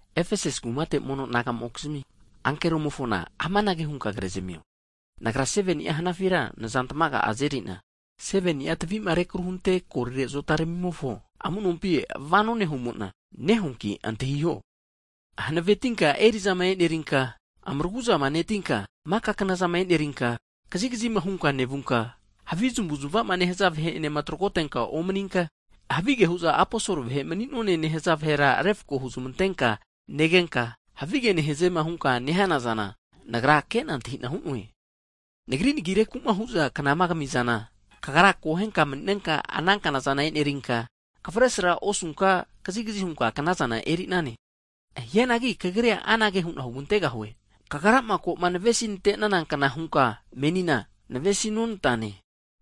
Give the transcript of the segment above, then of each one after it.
Efesasi kumate mono naga'mokizmi, ankeromofona amanage hunka kremio, Nagra 7ni'a hanafira nazantamaga azenerina, 7ni'a tavi'ma rekru hunte golire azotaramimofo amu'nompi vano nehumo'na, nehuanki antahiho. Hanavetinka eri'zama e'nerinka, maragu'zama netinka, maka knazama e'nerinka, kazigazima hunka nevunka, havi zamavu'zmava nehaza vahe'enema tragotenka omaninka, havige hu'za aposol vahe mani'none nehaza vahera refko huzmantenka negenka, havige nehaze hunkama nehanazana, Nagra ke'na antahi'na hu'noe. Nagri nagireku'ma hu'za knama kamizana, kagra akohenka mani'nenka, ana knazana enerinka, kavesragura osunka kazigazi hunka knazana eri'nane. Hianagi kagrira anage hu'na hugantegahue! Kagrama koma navesi nanteneankna hunka menina, navesi nonantane.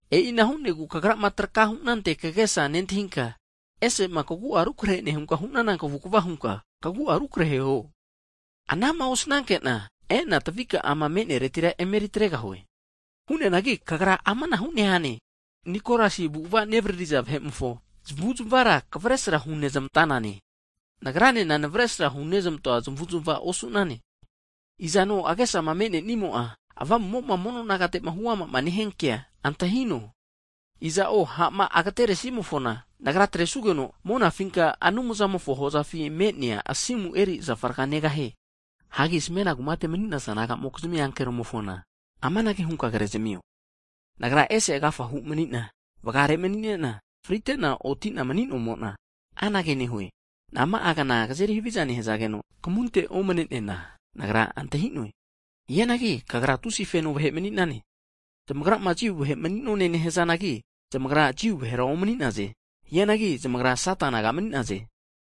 E'ina hu'negu kagrama trakama hu'nante kagesa nentahinka, ese'ma kagu'a rukrehe nehunka hu'nana kavukva hunka, kagu'a rukrehe huo. Anama osananke'na, e'na tavika'ama me'neretira emeri atregahue. Hu'neanagi kagra amanahu nehane, Nikolasi avu'ava'ma nevaririza vahe'mofo zamavu'zmavara kavesra hu'zmante'nane. Nagranena navesra hunezmantoa zamavu'zmava osu'nane. Izano agesama me'nenimo'a, Avamumo'ma mono nagate'ma huamama nehia kea antahino, iza'o ha'ma ageteresimofona, Nagra atresugeno, monafinka Anumzamofo hozafi me'nea asimu eri zafa raga negahie. Hagi Smena kumate mani'naza mono naga'mokizmi ankeromofona amanage hunka krezamio, Nagra'a ese agafahu mani'na, vagare mani'nena, frite'na otina mani'nomo'na, anage nehue, Nama'agna kazeri haviza nehazageno, kamunte omne'neana Nagra antahi'noe. Hianagi kagra tusia feno vahe mani'nane, zamagrama Jiu vahe mani'none nehazanagi, zamagra Jiu vahera omani'naze. Hianagi zamagra Sata naga mani'naze.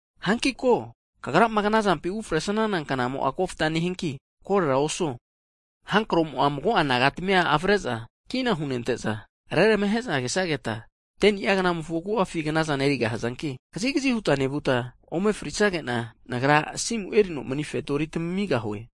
Hanki ko, kagrama knazampi ufresnana knamo'a kofta nehianki korera osuo. Sata'a hanige'za mago'a nagatamia zamavare'za kina hunezmante'za, reramahe'za kesageta 10ni'a gnamofo agu'afi knazana erigahazanki, kazigazi huta nevuta ome frisagena, Nagra asimu erino mani asimura tamamigahue.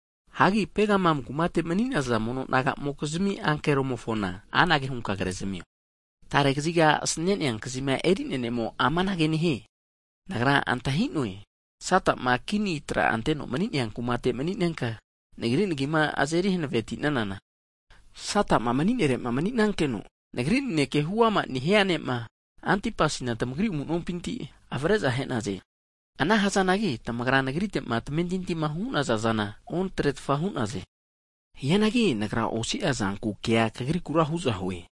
Hagi Pegamam kumate nemaniza mono naga'mokizmi ankeromofona amanage hunka krezamio, tarega kaziga asanenea kazima eri'nea ne'mo'a amanage nehie. Nagra antahi'noe, Sata'ma kini tra anteno mani'nea kumate mani'nenka, Nagri nagima azeri hanavemati'nanana, Sata'ma mani'nere'ma mani'nankeno, Nagri naneke huama nehia ne'ma, Antipasina tamagri amu'nompinti avare'za ahe'naze. Ana hazanagi tamagra Nagrite'ma tamamentintima hu'naza zana otretfa hu'naze. Hianagi Nagra osia zanku kea kagrikura huzahue,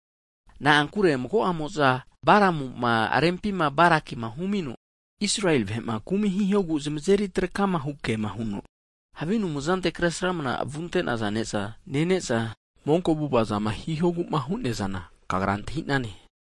na'ankure mago'amo'za Baramu'ma rempima Barakima humino, Israeli vahe'ma kumi hihogu zamazeri trakama hukema huno, havi anumzante Kresramana vunte'naza ne'za nene'za, monko avu'avazama hihogu'ma hu'neazana kagra antahi'nane.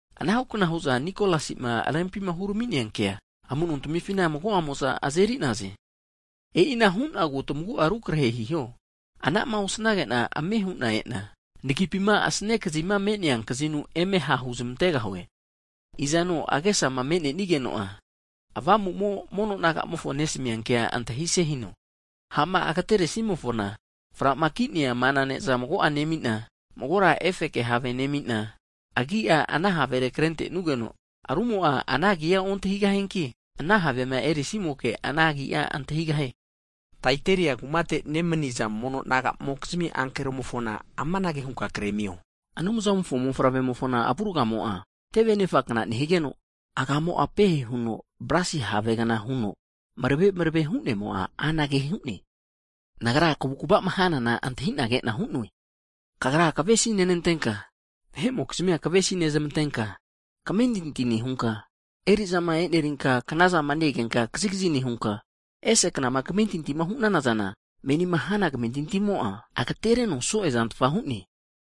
Anahukna hu'za Nikolasi'ma rempima hurami'nea kea amu'nontamifina mago'amo'za azeri'naze. E'ina hu'nagu tamagu'a rukrehehiho, anama osanage'na ame hu'na e'na, nagipima asane kazima me'nea kazinu, eme ha' huzmantegahue. Izano agesama me'nenimo'a Avamumoma mono nagamofo nesamia naneke antahise hino. Ha'ma agateresimofona, framaki'nea mana ne'za mago'a nemina, magora efeke have nemina, agi'a ana havere krentenugeno, rumo'a ana agia ontahigahianki, ana havema erisimoke, ana agia antahigahie. Taiataira kumate nemaniza mono naga'mokizmi ankeromofona amanage hunka krezamio, Anumzamofo mofavremofona avurgamo'a teve anefakna nehigeno, agamo'a pehe huno bronsi havegna huno marave marave hu'nemo'a anage hu'ne. Nagra kavukvama hanana antahi'na ke'na hu'noe. Kagra kavesinenantenka, vahe'mokizmia kavesi nezmantenka, kamentinti nehunka, eri'zama e'nerinka knazama ne-egenka kazigazi nehunka, ese knama kamentintima hu'nana zana, menima hana kamentintimo'a agatereno so'e zantfa hu'ne.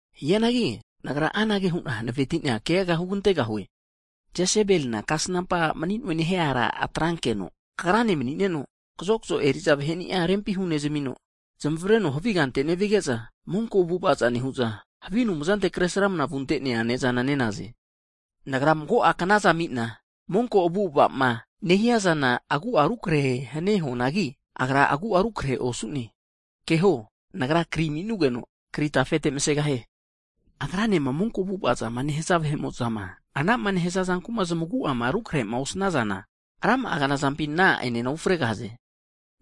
Hianagi Nagra anage hu'na hanaveti'na keaga hugantegahue. Jesebelina kasnampa a' mani'noe nehia ara atrankeno, kagrane mani'neno, kazokazo eri'za vaheni'a rempi hunezamino, zamavreno havi kante nevige'za, monko avu'ava zana nehu'za, havi anumzante kresramna vunte'nea ne'zana ne'naze. Nagra mago'a knaza ami'na, monko avu'ava'ma nehiazana agu'a rukrehe hanie huanagi, agra agu'a rukrehera osu'ne. Keho, Nagra kri ami'nugeno, kri tafete masegahie. Agranema monko avu'avazama nehaza vahe'mo'za, anama nehaza zanku'ma zamagu'ama rukrehema osnazana, rama'a knazampi ana a'ene ufregahaze.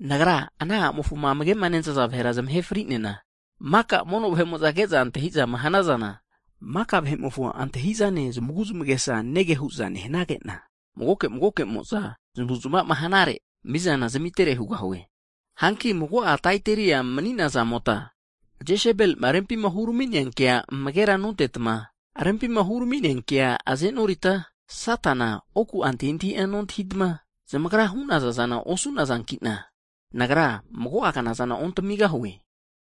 Nagra ana a'mofoma amage'ma nentaza vahera zamahe fri'nena, maka mono vahe'mo'za ke'za antahi'zama hanazana, maka vahe'mofo antahi'zane, zamagu'zmagesa nege hu'za nehanage'na, magoke magokemozama zamavu'zmavama hanare, mizana zamitere hugahue. Hanki mago'a Taiataria mani'nazamota Jesebelima rempi hurami'nea kea amagera nontetma, rempima hurami'nea kea azenoritma, Satana oku'a antahintahia nontahitma, zamagrama hu'naza zana osu'nazanki'na, Nagra mago'a knazana ontamigahue.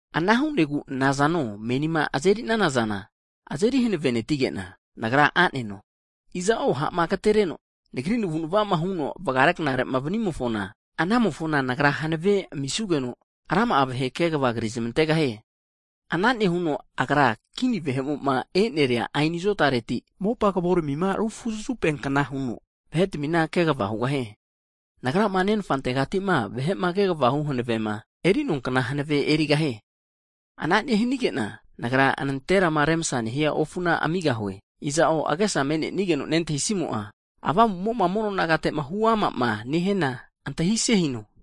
Ana hu'negu nazano menima azeri'nana zana azeri hanavetinege'na, Nagra a'neno. Iza'o ha'ma agatenereno, Nagri navu'nava huno vagare knare'ma vanimofona, anamofona Nagra hanavea amisugeno, rama'a vahe kegava krizmantegahie. Ana nehuno agra kini vahe'mo'ma e'neria aeni azotareti, mopa kavoramima rufuzafu'peankna huno vahetamina kegava hugahie. Nagrama Nenfantegatima vahe'ma kegava hu hanavema, eri'noankna hanave erigahie. Ana nehanige'na Nagra nanterama remsa nehia ofuna amigahue. Iza'o agesama me'nenigeno nentahisimo'a, Avamu'mo'ma mono nagate'ma huamama nehiana antahise hino.